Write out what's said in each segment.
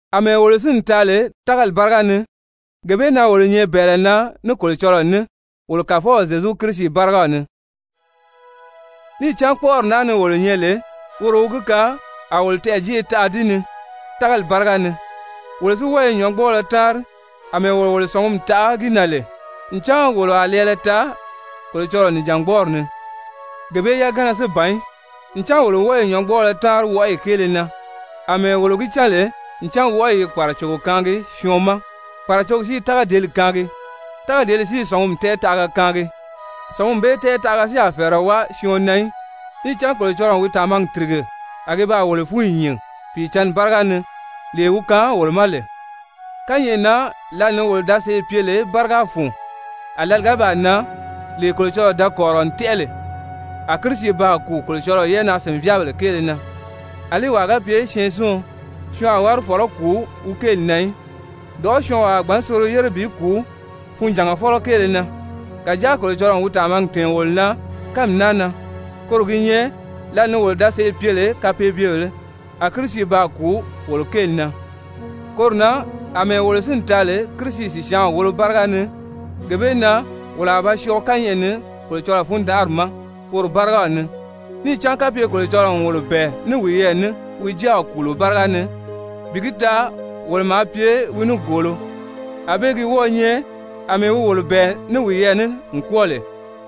Amɛɛ wolo sínni taa lè tágali báriga ni, gee bee na wolo nyɛ bɛ̀ɛlɛ na ní Kolocɔlɔɔ ní wolo Kàfɔw Zyezu Kirisi bárigaw ni. Níì cán kpɔ́ʔɔri naa ni wolo nyɛ lè woro wi gi kaan a wolo tɛɛ̀jeʔe taa di ni tágali báriga ni. Wolo si wɔ́ɔ i nyɔ̌ngbɔɔlɔ táanri àmɛɛ wolo wolo sɔ̀ngumi taʔa gi na lè, ncan wolo a lɛɛlɛ taa Kolocɔlɔɔ nìjangbɔɔri ni. Gee bee yagana si ban í, ncan wolo wɔ́ɔ i nyɔ̌ngbɔɔlɔ táanri wɔʔɔyi kéele na àmɛɛ wolo gi cán lè ncan wɔʔɔyi i kpàracogo kaangi syɔɔn ma, kpàracogi si i tágadeeli kaangi, tágadeeli si i sɔ̀ngumi tɛɛtaʔaga kaangi. Sɔ̀ngumi bee tɛɛtaʔaga si a fɛ̀ɛrɛ wáa syɔɔn na í, níì cán Kolocɔlɔɔ n wi tàmagi tìrige, a gi baa wolo fúnyi nyìn Pìicǎnni báriga ni lee wi kaan wolo ma lè. Kányɛʔɛ na lǎli ni wolo da sèʔê pye lè báriga fun, a lǎli ga baa nan, lee Kolocɔlɔɔ da kɔ̀rirɔ n tɛ́ʔɛ lè, a Kirisi baa kùu Kolocɔlɔɔ yɛ́ʔɛnaa-sìnvyaabèle kéele na. Alí wàa ga pye syɛɛnsiɔn, syɔɔn a wári fɔ̀lɔ́ kùu wi kéeli na í. Dɔ̀ʔɔ́ syɔɔnwaa a gbǎn soro yére bi kùu funjàngafɔlɔ kéele na. Kàjáa Kolocɔlɔɔ n wi tàmagi tɛ̀ɛn wolo na kánmi naa na, koro gi nyɛ lǎli ni wolo da sèʔê pye lè kapeebyebèlē, a Kirisi baa kùu wolo kéeli na. Koro na àmɛɛ wolo sínni taa lè Kirisi sìsyaanw wolo báriga ni, gee bee na wolo a ba syɔɔ kányɛʔɛ ni Kolocɔlɔɔ fundanʔari ma woro bárigaw ni. Níì cán kapye Kolocɔlɔɔ n wolo bɛ̀ɛ ní wiyɛɛ ní wi Jáaw kùulo báriga ni, bi gi taa wolo maa pye wi nigoolo, ànbée gi wɔ́ɔ̄ nyɛ àmɛɛ wi wolo bɛ̀ɛ ní wiyɛɛ ní n kwɔ́ɔ lè,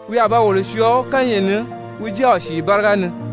wi a ba wolo syɔɔ kányɛʔɛ ni wi Jáaw sìi báriga ni.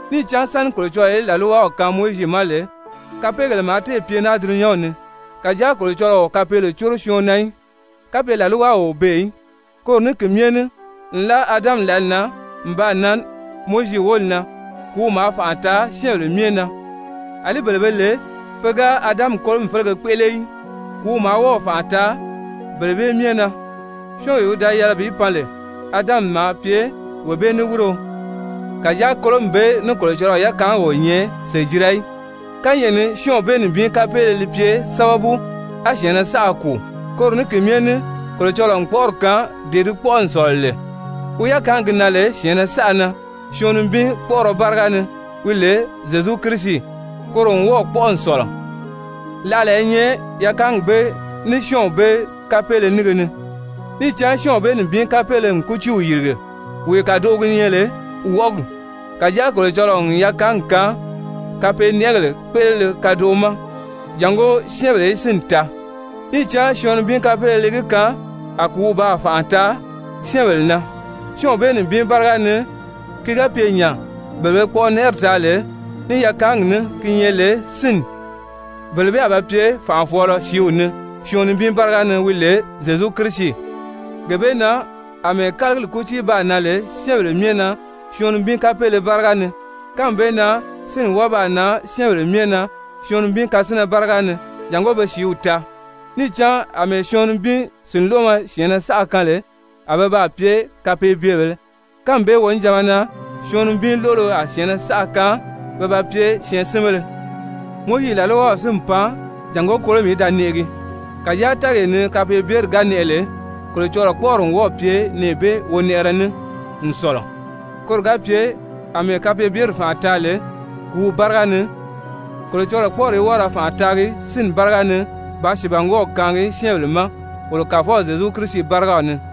Níì cán sáni Kolocɔlɔɔ í làlwaw kaan Mowizi ma lè, kapeegèle maa téè pye naa dulunyanw ni. Kàjáa Kolocɔlɔɔ o kapeele córo syɔɔn na í, kapye làlwaw o beè í. Koro ní ki myɛ ní nlaa Adami lǎli na n baa nan Mowizi wóli na kùúw maa fànʔa taa syɛ́ɛnbèle myɛ na, àlí bele be lè pe ga Adami kolomi félege kpéʔele í, kùúw maa wɔ́ɔ̀ fànʔa taa bele bee myɛ na. Syɔ́ɔnwee wi da yɛlɛ wi pan lè, Adami maa pye wee bee niwirio. Kàjáa kolomi bee ní Kolocɔlɔɔ yakaangi o nyɛ sèjira í. Kányɛʔɛ ni syɔ́ɔnw bee nibin kapeele li pye sábabu, a syɛ̀ɛnnɛ saʔa kùu, koro ní ki myɛ ní Kolocɔlɔɔ n kpɔʔɔrɔ kaan dee di kpɔ́ʔɔ n sɔ̀lɔ lè, wi yakaangi gi nan lè syɛ̀ɛnnɛ saʔa na syɔɔn nibin kpɔ́ʔɔrɔ báriga ni, wi lè Zyezu Kirisi, koro n wɔ́ɔ̀ kpɔ́ʔɔ n sɔ̀lɔ. Láʔala i nyɛ yakaangi bee, ní syɔ́ɔnw bee kapeele nínge ni. Níì cán syɔ́ɔnw bee nibin kapeele n kútiiw yìrige, wee kàdoʔo gi nyɛ lè wɔʔɔgi, kàjáa Kolocɔlɔɔ n yakaangi kaan kapeenɛʔɛgèle kpéʔelele kadoʔo ma, jàngó syɛ́ɛnbèle í sínni taa. Níì cán syɔɔn nibin kapeele li gi kaan a kùúw baa fànʔa taa syɛ́ɛnbèle na syɔ́ɔnw bee nibin báriga ni, ki ga pye nya, bele be kpɔʔɔnɛʔɛri taa lè ní yakaangi ní ki nyɛ lè sínni, bele bee a ba pye fànʔafɔɔlɔ sìíw ni syɔɔn nibin báriga ni wi lè Zyezu Kirisi. Gee bee na àmɛɛ kálagili kútii baa nan lè syɛ́ɛnbèle myɛ na syɔɔn nibin kapeele báriga ni, kánmi bee na sínni wɔ́ɔ baa nan syɛ́ɛnbèle myɛ na syɔɔn nibin kasinnɛ báriga ni jàngó be sìíw taa. Níì cán àmɛɛ syɔɔn nibin sìnloʔomɔ syɛ̀ɛnnɛ saʔa kaan lè a be baa pye kapeebyebèlē, kánmi bee wonijanma na syɔɔn nibin lóʔolo a syɛ̀ɛnnɛ saʔa kaan pe ba pye syɛɛnsinbéle. Mowizi làlwaw si n pan jàngó kolomi í da nɛʔɛgi. Kàjáa tɛ́ɛgee ni kapeebyeri ga nɛʔɛ lè, Kolocɔlɔɔ kpɔ́ʔɔri n wɔ́ɔ̀ pye nɛɛ bee wonɛʔɛrɛ ní n sɔ̀lɔ, koro ga pye àmɛɛ kapeebyeri fànʔa taa lè kùúw báriga ni, Kolocɔlɔɔ kpɔ́ʔɔri í wɔ́ɔ ra fànʔa taagi sínni báriga ni bàā sìibangwɔɔw kaangi syɛ́ɛnbèle ma wolo Kàfɔw Zyezu Kirisi bárigaw ni.